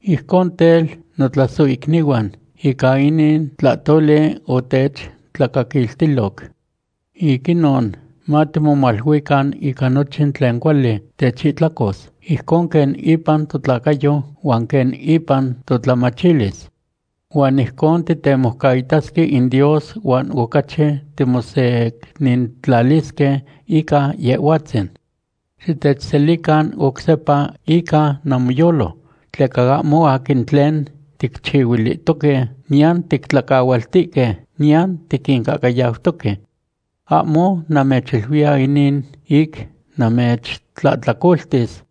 Ijcon tel, notlasohicnihuan, ica inin tlahtoli otechtlacaquiltiloc. Ic inon matimomaluican ica nochin tlen cuali techihtlacos, ijcon quen ipan totlacayo huan quen ipan totlamachilis. Huan ijcon titemoucaitasque in Dios, huan ocachi timosecnintlalisque ica Yehhuatzin. Xitechselican oc sepa ica namoyolo, tleca ahmo aquin tlen ticchihuilihtoque, niyan tictlacahualtihque, niyan tiquincahcayautoque. Ahmo namechiluiya inin ic namechtlahtlacoltis.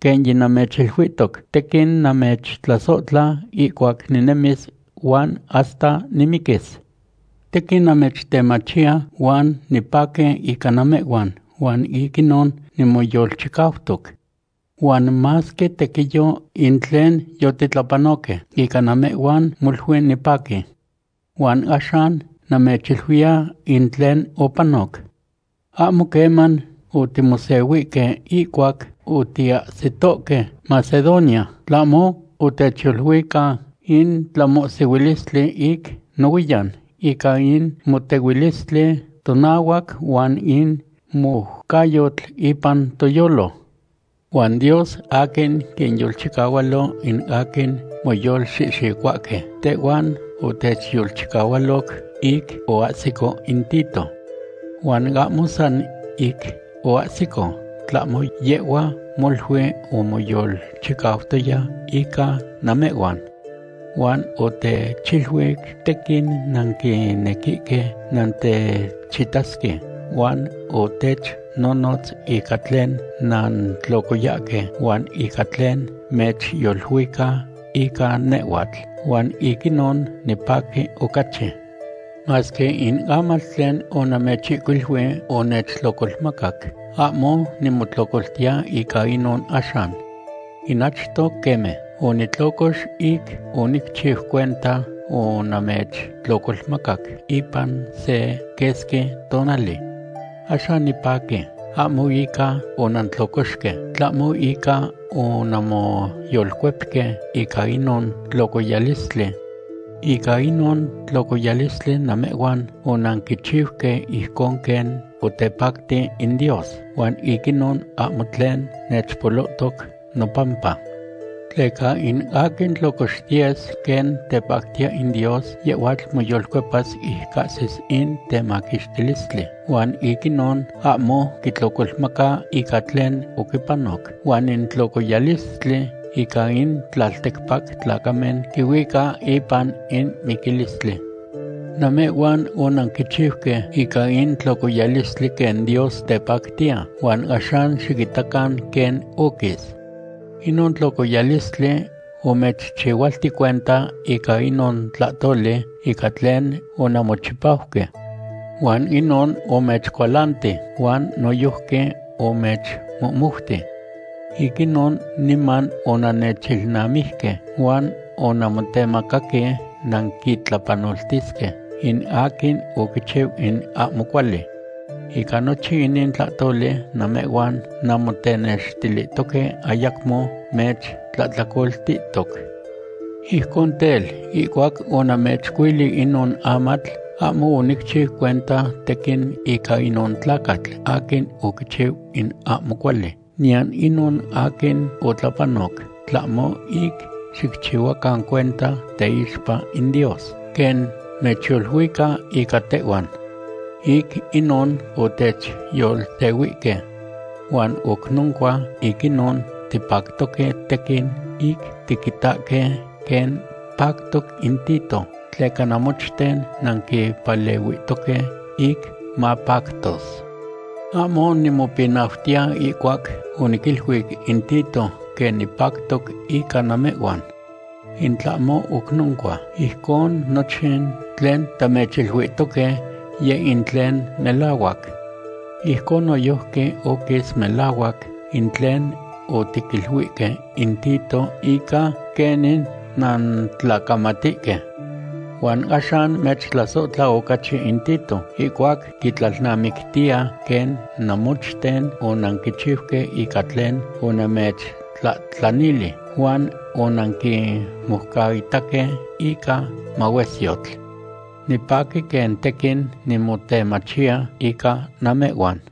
Quen yinamechiluihtoc, tequin namechtlasohtla ihcuac ninemis huan hasta nimiquis. Tequin namechtemachiya huan nipaqui ica namehhuan huan ic inon nimoyolchicautoc. Huan masque tequiyo in tlen yotitlapanohque, ica namehhuan molui nipaqui. Huan axan namechiluiya in tlen opanoc. Ahmo queman otimosehuihque ihcuac otiahsitoque Macedonia, tlahmo otechyoluica in tlamohsihuilistli ic nohuiyan; ica in motehuilistli tonahuac huan in moucayotl ipan toyolo. Huan Dios, aquin quinyolchicahualo in aquin moyolxihxicohuahque, tehhuan otechyolchicahualoc ic oahsico in Tito. Huan ahmo san ic oahsico, tlahmo yehhua molui omoyolchicautoya ica namehhuan. Huan otechiluic tequin nanquinequihque nantechitasque huan otechnonotz ica tlen nantlocoyahque huan ica tlen mechyoluica ica nehhuatl, huan ic inon nipaqui ocachi. Masque in amatl tlen onamechihcuilui omechtlocolmacac, ahmo nimotlocoltiya ica inon axan. In achto queme, onitlocox ic onicchiu cuenta onamechtlocolmacac ipan se quesqui tonali. Axan nipaqui, ahmo ica onantlocoxque, tlahmo ica onanmoyolcuepque ica inon tlocoyalistli. Ica inon tlocoyalistli namehhuan onanquichiuque ijcon quen otepacti in Dios, huan ic inon ahmo tlen mechpolohtoc nopampa. Tleca in aquin tlocoxtiyes quen tepactiya in Dios, yehhuatl moyolcuepas ic cahsis in temaquixtilistli, huan ic inon ahmo quitlocolmaca ica tlen oquipanoc. Huan in tlocoyalistli ica in tlalticpac tlacamen quihuica ipan in miquilistli. Namehhuan onanquichiuque ica in tlocoyalistli quen Dios tepactiya, huan axan xiquitacan quen oquis. Inon tlocoyalistli omechchihualti cuenta ica inon tlahtoli ica tlen onanmochipauque. Huan inon omechcualanti huan noyojqui omechmohmouti. Ic inon niman onannechilnamiquihque huan onanmotemacaque nanquitlapanoltisque in aquin oquichiu in ahmo cuali. Ica nochin inin tlahtoli namehhuan nanmotenextilihtoque ayacmo mechtlahtlacoltihtoc. Ijcon tel, ihcuac onamechihcuili inon amatl, ahmo onicchiu cuenta tequin ica inon tlacatl aquin oquichiu in ahmo cuali, niyan inon aquin otlapanoc, tlahmo ic xicchihuacan cuenta teixpa in Dios quen mechyoluica ica tehhuan. Ic inon otechyolsehuihque. Huan oc noncua ic inon tipactoque tequin ic tiquitahque quen pactoc in Tito, tleca namochten nanquipalehuihtoque ic mapactos. Ahmo nimopinautiya ihcuac oniquiluic in Tito quen nipactoc ica namehhuan. In tlahmo oc noncua, ijcon nochin tlen tamechiluihtoque yeh in tlen melahuac. Ijcon noyojqui oquis melahuac in tlen otiquiluihque in Tito ica quenin nantlacamatihque. Huan axan mechtlasohtla ocachi in Tito, ihcuac quitlalnamictiya quen namochten onanquichiuque ica tlen onamechtlahtlanili, huan onanquimoucaitahque ica mahuesyotl. Nipaqui quen tequin nimotemachiya ica namehhuan.